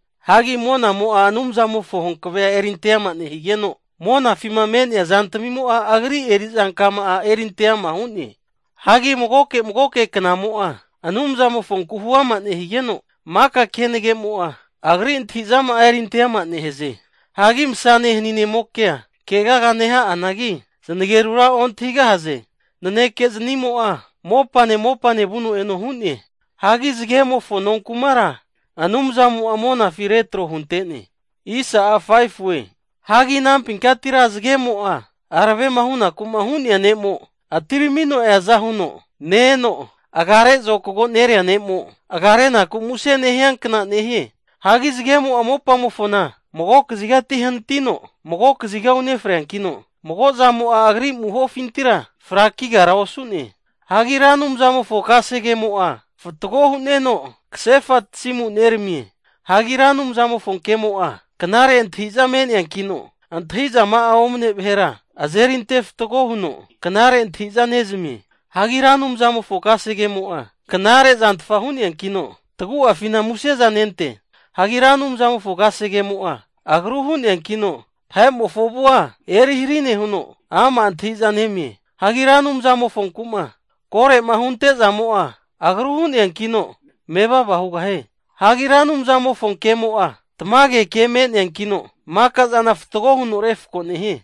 Hagi monamo'a Anumzamofo hankave'a erinte ama nehigeno, monafima me'nea zantamimo'a Agri erizankama'a erinte ama hu'ne. Hagi magoke magoke knamo'a Anumzamofoku hu'ama nehigeno, maka kenagemo'a Agri antahi'zama'a erinte ama nehaze. Hagi masane haninemokea kegaga neha'anagi, zanagerura ontahigahaze. Naneke zanimo'a mopane mopane vuno eno hu'ne. Hagi zagemofo nonkumara Anumzamo'a monafi retro hunte'ne. Hagi anampinkatira zagemo'a aravema hunaku hu'nea ne'mo atiramino eaza huno ne-eno, agare zokago nerea ne'mo agarenaku muse nehia kna nehie. Hagi zagemo'a mopamofona mago kazigati hanatino mago kaziga unefreankino, mago zamo'a agri amuhofintira frakigara osu'ne. Hagi Ra Anumzamofo kasegemo'a fatgo hu'neno kasefa tasimu neramie. Hagi Ra Anumzamofo kemo'a, knare antahi'za me'neankino antahizama'a omne vahera azeri ante fatgo huno knare antahi'za nezamie. Hagi Ra Anumzamofo kasegemo'a knare zantfa hu'neankino, tagu'afina musezanente. Hagi Ra Anumzamofo kasegemo'a, agru hu'neankino vahe'mofo avua eri hari nehuno, ama' antahiza nemie. Hagi Ra Anumzamofonku'ma kore'ma huntezamo'a agru hu'neankino mevava hugahie. Hagi Ra Anumzamofo kemo'a tamage ke me'neankino, makazana fatgo huno refako nehie.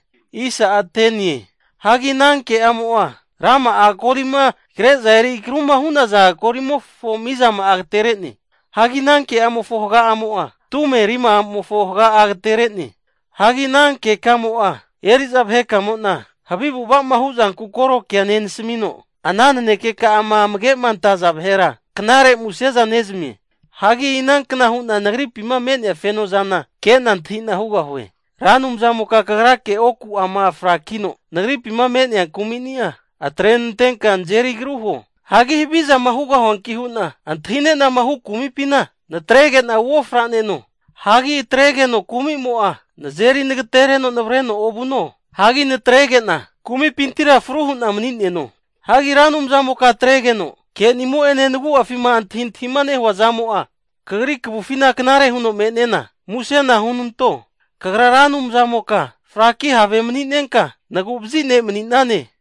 Hagi ana ke'amo'a, rama'a golima kre'za eri agruma hu'naza golimofo mizama'a agaterene. Hagi ana ke'amofo haga'amo'a tume rima'amofo haga'a agatere'ne. Hagi ana kekamo'a eri'za vahekamo'na havi avu'ava'ma huzanku koro kea nenasmino, ana nanekeka'ama amage'ma antaza vahera knare museza nezmie. Hagi inankna hu'na nagripima me'nea kefozana kena antahina hugahue? Ra Anumzamoka kagrake oku'ama frakino nagripima me'nea kumini'a atrenantenka nazeri agru huo. Hagi havizama hugahuanki hu'na antahine'nama hu kumipina natrege'na uofra'neno, hagi atregeno kumi'mo'a nazeri nagatereno navareno ovuno. Hagi natrege'na kumimpintira fru hu'na mani'neno. Hagi Ra Anumzamoka atregeno kenimo'ene nagu'afima antahintahima nehua zamo'a kagri kavufina knare huno me'nena musena hunanto. Kagra Ra Anumzamoka fraki have mani'nenka, nagu'vazi ne' mani'nane.